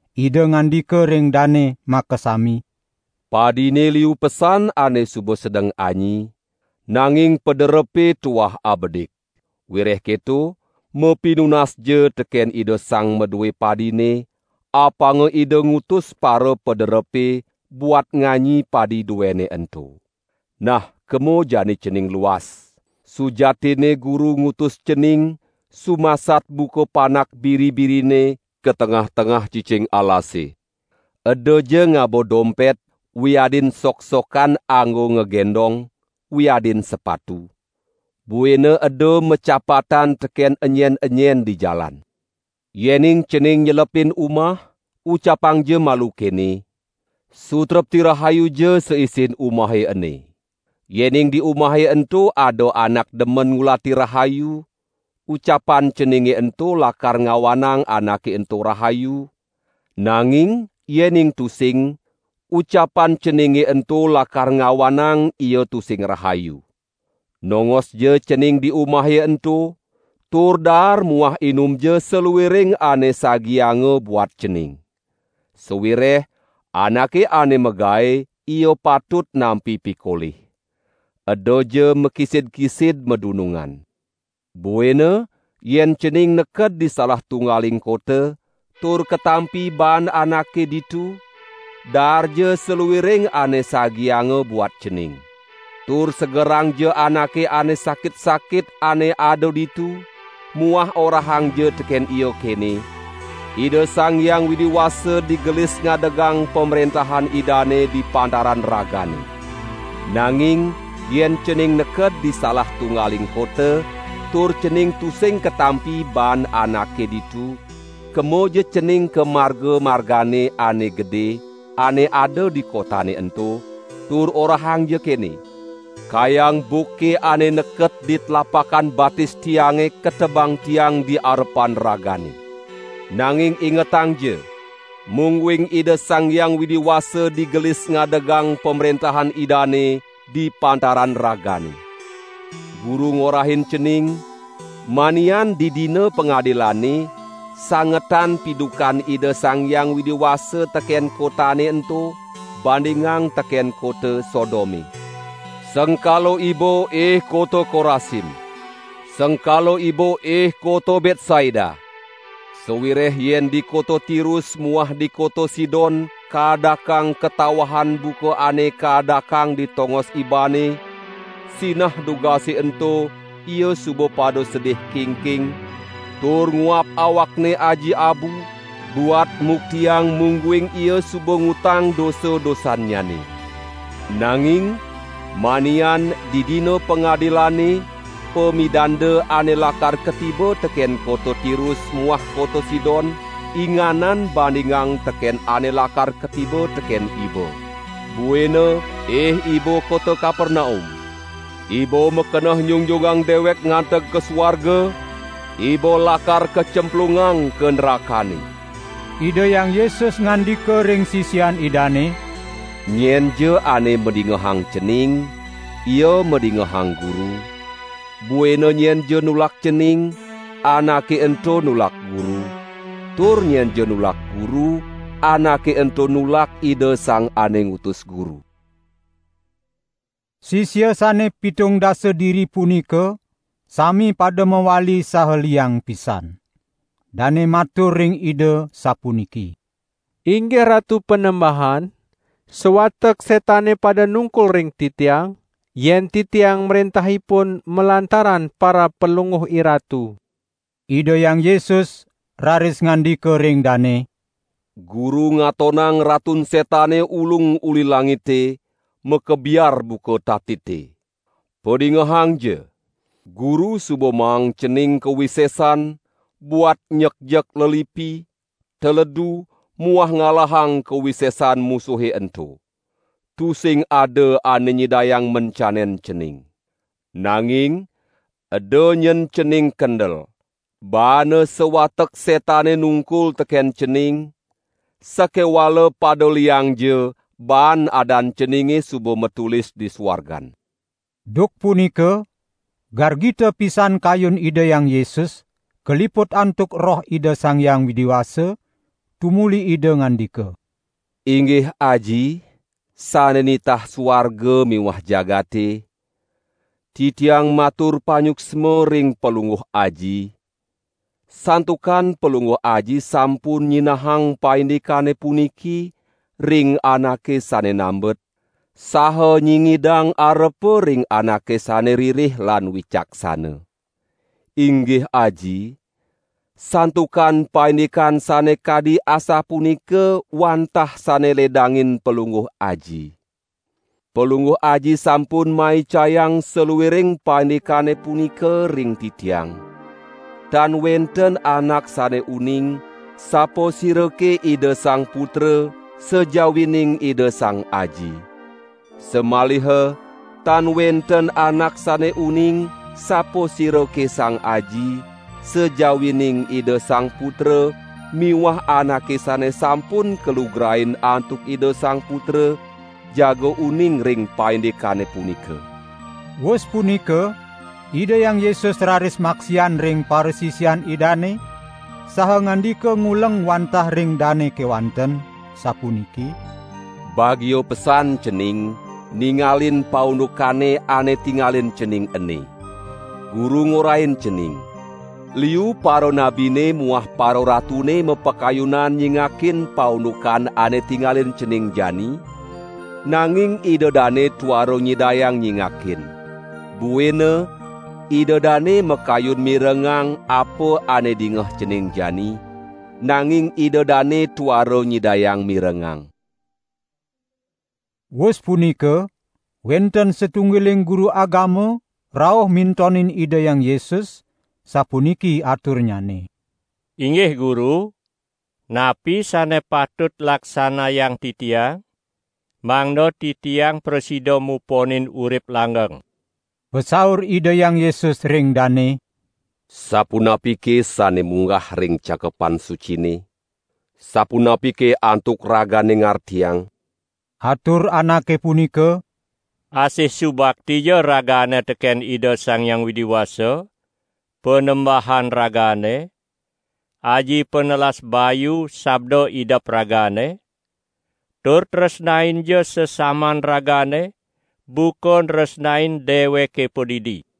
Ida ngandika ring dane makasami: "Padine liu pesan ane suba sedeng anyi, nanging pederepe tuah abedik. Wireh keto mapinunasja teken Ida Sang Madue padine, apanga Ida ngutus parapaderepe buat nganyi padi duene ento. Nah kema jani cening luas! Sujatinne Guru ngutus cening sumasat buka panak biri-birine ka tengah-tengah cicing alasane. Edaja ngaba dompet wiadin soksokan anggo ngagendong wiadin sepatu. Buina eda macapatan teken enyen-enyen di jalan." Yening cening nyelepin umah, ucapangja malu kene: "Sutrepti rahayuja saisin umahe ene! Yening di umahe ento ada anak demen ngulati rahayu, ucapan ceninge ento lakar ngawanang anake ento rahayu, nanging yening tusing, ucapan ceninge ento lakar ngawanang ia tusing rahayu. Nongosja cening di umahe ento, tur daar muah inumja saluiring ane sagianga buat cening. Sawireh anake ane magae ia patut nampi pikolih. Edaja makisid-kisid madunungan. Buina yen cening neked di salah tunggaling kota, tur katampi baan anake ditu, daarja saluiring ane sagianga buat cening. Tur segerangja anake ane sakit-sakit ane ada ditu muah orahangja teken ia kene: Ida Sang Hyang Widi Wasa digelis ngadegang Pamrentahan Idane di pantaran ragane! Nanging yen cening neked di salah tunggaling kota, tur cening tusing katampi baan anake ditu, kemaja cening ka marga-margane ane gede ane ada di kotane ento, tur orahangja kene: Kayang buka ane neket di tlapakan batis tiange ketebang tiang di arepan ragane. Nanging ingetangja, mungguing Ida Sang Hyang Widi Wasa digelis ngadegang Pamrentahan Idane di pantaran ragane! Guru ngorahin cening, manian di Dina Pangadilane, sangetan pidukan Ida Sang Hyang Widi Wasa teken kotane ento bandingang teken kota Sodome!" "Sengkala iba ih kota Korasim! Sengkala iba ih kota Betsaida! Sawireh yen di kota Tirus muah di kota Sidon kaadakang katawahan buka ane kaadakang di tongos ibane, sinah dugase ento ia suba pada sedih kingking, tur nguap awakne aji abu buat muktiang mungguing ia suba ngutang dosa-dosannyane. Nanging manian di Dina Pangadilane pamidanda ane lakar katiba teken kota Tirus muah kota Sidon inganan bandingang teken ane lakar katiba teken iba. Buina ih iba kota Kapernaum! Iba makeneh nyungjungang dewek nganteg ka suarga! Iba lakar kacemplungang ka nrakane!" Ida Hyang Yesus ngandika ring sisian Idane: "Nyenja ane madingehang cening, ia madingehang Guru; buina nyenja nulak cening anake ento nulak Guru; tur nyenja nulak Guru, anake ento nulak Ida Sang ane ngutus Guru." Sisia sane pitung dasa diri punika sami pada mawali saha liang pisan. Dane matur ring Ida sapuniki: "Inggih Ratu Panembahan, sawatek setane pada nungkul ring titiang, yen titiang mrentah ipun malantaran parab Palungguh IRatu." Ida Hyang Yesus raris ngandika ring dane: "Guru ngatonang Ratun Setane ulung uli langite, makebiar buka tatite. Padingehangja! Guru suba maang cening kawisesan buat nyekjek lelipi, teledu, muah ngalahang kawisesan musuhe ento. Tusing ada ane nyidayang mencanen cening. Nanging eda nyen cening kendel, baana sawatek setane nungkul teken cening, sakewala pada liangja baan adan ceninge suba matulis di suargan." Duk punika, gargita pisan kayun Ida Hyang Yesus, kaliput antuk Roh Ida Sang Hyang Widi Wasa, tumuli Ida ngandika: "Inggih Aji, sane nitah suarga miwah jagate, Titiang matur panyuksma ring Palungguh Aji, santukan Palungguh Aji sampun nyinahang paindikane puniki ring anake sane nambet, saha nyingidang arepa ring anake sane ririh lan wicaksana. Inggih Aji, santukan paindikan sane kadi asapunika wantah sane ledangin Palungguh Aji. Palungguh Aji sampun maicayang saluiring paindikane punika ring Titiang. Tan wenten anak sane uning, sapasirake Ida Sang Putra sajawining Ida Sang Aji. Samaliha tan wenten anak sane uning sapasirake Sang Aji, sajawining Ida Sang Putra miwah anake sane sampun kalugrain antuk Ida Sang Putra, jaga uning ring paindikane punika." Wus punika Ida Hyang Yesus raris maksian ring parasisian Idane saha ngandika nguleng wantah ring dane kewanten, sapuniki: "Bagia pesan cening ningalin paundukane ane tingalin cening ene. Guru ngorahin cening, liu paranabine muah pararatune mapakayunan nyingakin paundukan ane tingalin cening jani, nanging ida dane tuara nyidayang nyingakin. Buina ida dane makayun mirengang apa ane dingeh cening jani, nanging ida dane tuara nyidayang mirengang." Wus punika wenten satunggiling guru agama, rauh mintonin Ida Hyang Yesus, sapuniki aturnyane: "Inggih Guru, napi sane patut laksanayang titiang, mangda titiang prasida muponin urip langgeng?" Pasaur Ida Hyang Yesus ring dane: "Sapunapike sane munggah ring Cakepan Sucine? Sapunapike antuk ragane ngartiang?" Atur anake punika: "Asih subaktija ragane teken Ida Sang Hyang Widi Wasa, Panembahan ragane, aji panelas bayu sabda idep ragane, tur tresnainja sesaman ragane, buka nresnain deweke padidi."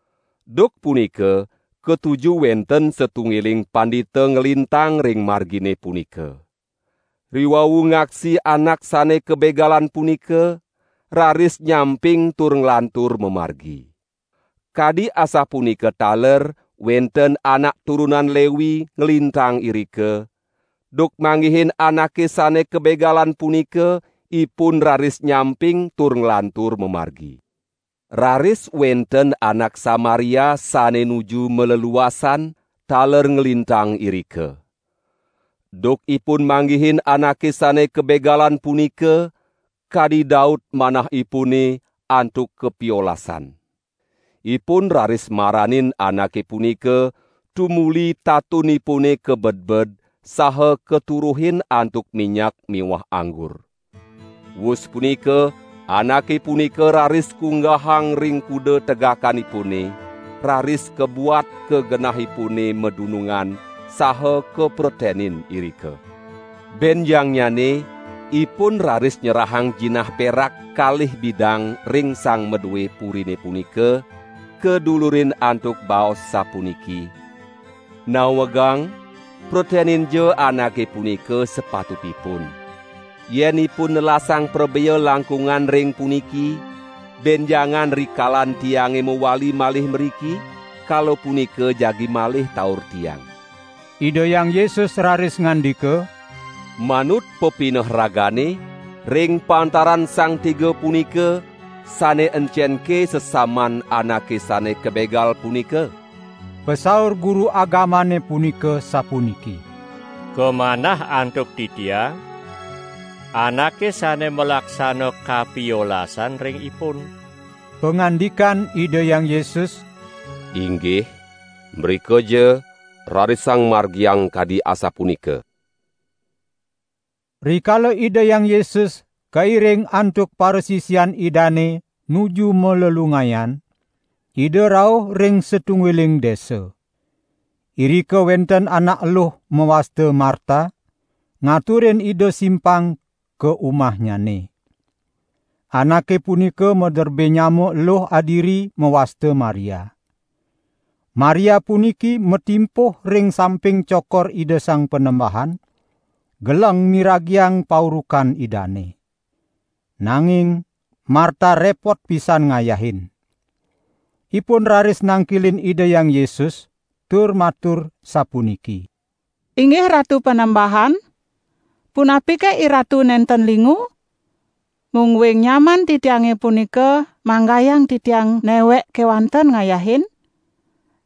Duk punika katuju wenten satunggiling pandita nglintang ring margine punika. Riwau ngaksi anak sane kabegalan punika, raris nyamping tur nglantur mamargi. Kadi asapunika taler wenten anak turunan Lewi nglintang irika; duk manggihin anake sane kabegalan punika, ipun raris nyamping tur nglantur mamargi. Raris wenten anak Samaria sane nuju maleluasan, taler nglintang irika. Duk ipun manggihin anake sane kabegalan punika, kadi daut manahipune antuk kapiolasan. Ipun raris maranin anake punika tumuli tatunipune kabedbed saha katuruhin antuk minyak miwah anggur. Wus punika anake punika raris kunggahang ring kuda tegakanipune, raris kabuat ka genahipune madunungan saha kapretenin irika. Benjangnyane, ipun raris nyerahang jinah perak kalih bidang ring sang madue purine punika, kadulurin antuk baos sapuniki: 'Nawegang preteninja anake punika sapatutipun. Yen ipun nelasang prabea langkungan ring puniki, benjangan rikalan tiange mawali malih mriki, kala punika jagi malih taur tiang.'" Ida Hyang Yesus raris ngandika: "Manut pepineh ragane, ring pantaran sang tiga punika, sane encenke sesaman anake sane kabegal punika?" Pasaur guru agamane punika sapuniki: "Kamanah antuk titiang, anake sane malaksana kapiolasan ring ipun." Pangandikan Ida Hyang Yesus: "Inggih, mrikaja rarisang margiang kadi asapunika!" Rikala Ida Hyang Yesus kairing antuk parasisian Idane nuju malelungayan, Ida rauh ring satunggiling desa. Irika wenten anak eluh mawasta Marta, ngaturin Ida simpang ka umahnyane. Anake punika maderbe nyama eluh adiri mawasta Maria. Maria puniki matimpuh ring samping cokor Ida Sang Panembahan, geleng miragiang paurukan Idane. Nanging Marta repot pisan ngayahin. Ipun raris nangkilin Ida Hyang Yesus tur matur sapuniki: "Inggih Ratu Panembahan, punapike IRatu nenten lingu, mungguing nyaman titiange punika manggayang titiang newek kewanten ngayahin?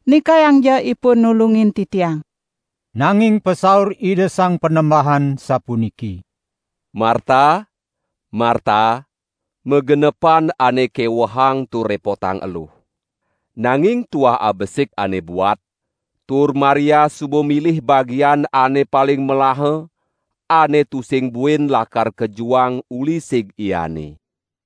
Nikayangja ipun nulungin titiang!" Nanging pasaur Ida Sang Panembahan, sapuniki: "Marta, Marta, magenepan ane kewehang tur repotang eluh. Nanging tuah abesik ane buat, tur Maria suba milih bagian ane paling melaha, ane tusing buin lakar kajuang uli sig iane."